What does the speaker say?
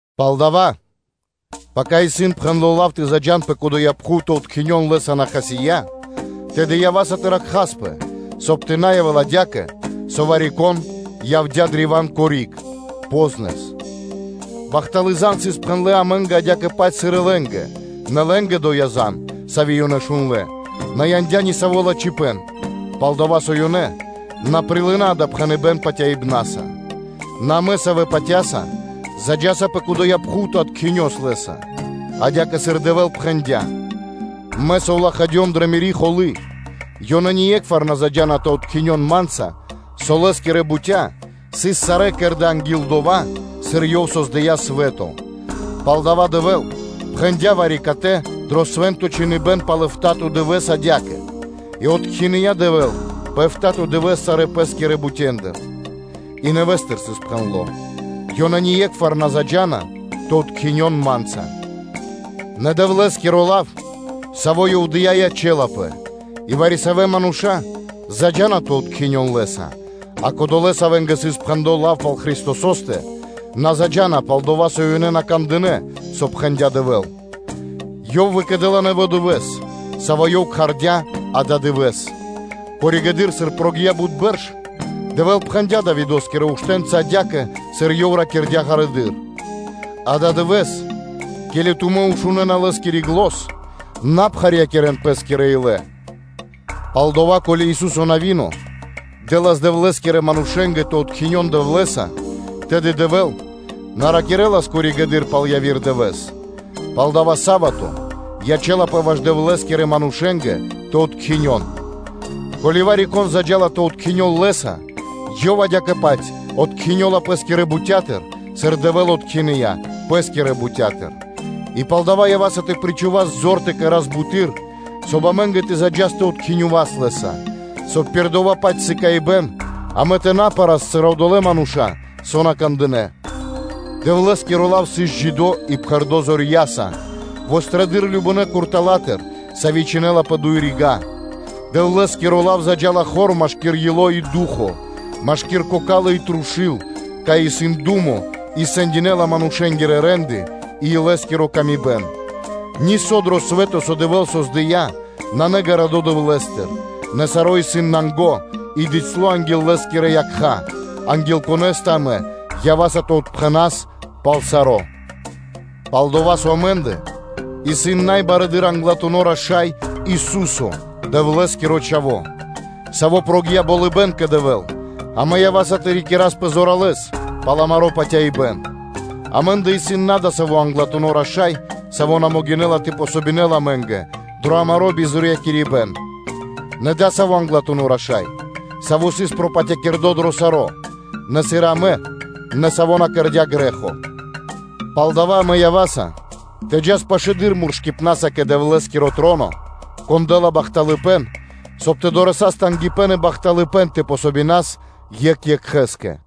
Палдава́, пака пхэндло́ лав амэ́нгэ тэ заджа́н пэ доя́ пхув тэ откхинён Лэ́са, на хасия́, тэды ява́са тэ ракхаспэ, соб (кай) тэ на явэ́л адя́кэ, со вари-кон явдя́ древа́н кори́г (по́знэс). Бахталы́ зан (звесь) сыс пхэндлы амэ́нгэ, адя́кэ-паць сыр и лэ́нгэ, нэ лэ́нгэ доя́ зан, сави́ ёнэ шундлэ́, на яндя́ ни саво́ лачхипэ́н, пал-дова́ со ёнэ на прилынэ́ дава́ пхэныбэ́н патяибна́са. Нэ амэ, савэ́ патя́са, заджаса пэ доя́ пхув тэ откхинёвас Лэ́са, адя́кэ, сыр Дэвэ́л пхэндя́: “Мэ совлахадём дрэ Мири́ холы́: “Ёнэ ние́кхвар на заджа́на тэ откхинён Ма́нца’”, на дыкхи́ пэ дова́, со Лэ́скирэ бутя́ сыс сарэ́ кэрдэ́ анги́л дова́, сыр Ёв создыя́ свэ́то. Палдава́ Дэвэ́л пхэндя́ вари-катэ дро Свэ́нто Чхиныбэ́н пал эфта́то (битринэ́нгиро дэ́што) дывэ́с адя́кэ: “И откхиныя Дэвэ́л пэ эфта́то дывэ́с сарэ́ Пэ́скирэ бутендыр”: и нэвэ́стыр исын пхэндло́: “Ёнэ ние́кхвар на заджа́на тэ откхинён Ма́нца.” Нэ Дэвлэ́скиро лав, саво́ Ёв дыя́, ячэ́лапэ, и вари-савэ́ мануша́ заджа́на тэ откхинён Лэ́са; а кодолэ́, савэ́нгэ сыс пхэндло́ лав пал Христосо́стэ, на заджа́на, пал-дова́ со ёнэ на кандынэ́, со пхэндя́ Дэвэ́л, и Ёв выкэдэ́ла нэво́ дывэ́с, саво́ Ёв кхардя́ “ададывэ́с.” Пало́ (после) дова́, сыр прогия́ (накхця) бут бэрш, Дэвэ́л пхэндя́ Давидо́скирэ уштэ́нца адя́кэ, сыр Ёв ракирдя́ ґарэдыр: “Ададывэ́с, ке́ли тумэ́ шунэ́на Лэ́скири зан (глос), на пхарьякирэн пэ́скирэ илэ.” Палдава́, ко́ли Ису́со-Навино дэ́лас Дэвлэ́скирэ манушэ́нгэ тэ откхинён Дэвлэ́са, тэды Дэвэ́л на ракирэ́лас коригэды́р (позжэды́р) пал яви́р дывэ́с. Палдава́ са́вато (субо́та) ячэ́лапэ ваш Дэвлэ́скирэ манушэ́нгэ тэ откхинён. Ко́ли вари-кон заджа́ла тэ откхинёл Лэ́са, ёв адя́кэ-паць откхинёла пэ́скирэ бутя́тыр, сыр Дэвэ́л откхиныя Пэ́скирэ бутя́тыр. И палдава́ ява́са амэ тэ причхувас зор тэ кэра́с буты́р, соб (кай) амэ́нгэ тэ заджас тэ откхинёвас Лэ́са, соб (кай) пир дова́-паць приме́ро (сыкаибэ́н) амэ тэ на пэрас, сыр одолэ́ мануша́, савэ́ на кандынэ́. Дэвлэ́скиро лав исын джидо́ и пхэрдо́ зорья́са, вострэдыр (чолалэды́р) любонэ куртала́тыр, сави́ чхинэла пэ дуй рига́, Дэвлэ́скиро лав заджа́ла хор машки́р ило́ и ду́хо (фа́но), машки́р кокалы́ и трушу́л, кай исын думо, и сэндинэла манушэ́нгирэ рэ́нды и мысли пэ ило́. Нисо́ дро свэ́то, со Дэвэ́л создыя́, нанэ ґарадо Дэвлэ́стыр; нэ саро́ исын нанго и бицяло́ анги́л Лэ́скирэ якха́, анги́л Конэ́стэ амэ ява́са тэ отпхэнас пал саро́. Пал-дова́ со амэ́ндэ исын са́мо барэды́р Англатуно́ Раша́й Ису́со, Дэвлэ́скиро Чхаво́, Саво́ прогия́ болыбэ́н кэ Дэвэ́л, амэ ява́са тэ рикираспэ зоралэ́с пал амаро́ патяибэ́н. Амэ́ндэ исын на адасаво́ англатуно́ раша́й, саво́ на могинэ́ла тэ помогинэл (тэ подэл васт) амэ́нгэ дро амаро́ бизорьякирибэн, нэ Адасаво́ Англатуно́ Раша́й, Саво́ сыс пропатякирдо дро саро́, нэ сыр и амэ, нэ Саво́ на кэрдя́ грэ́хо. Палдава́ амэ ява́са тэ джас пашылэды́р муршыпнаса кэ Дэвлэ́скиро троно, Кон дэ́ла бахталыпэ́н, соб (кай) тэ дорэсас тангипэ́н и бахталыпэ́н тэ помогинас (тэ подас васт) екх екхэ́скэ.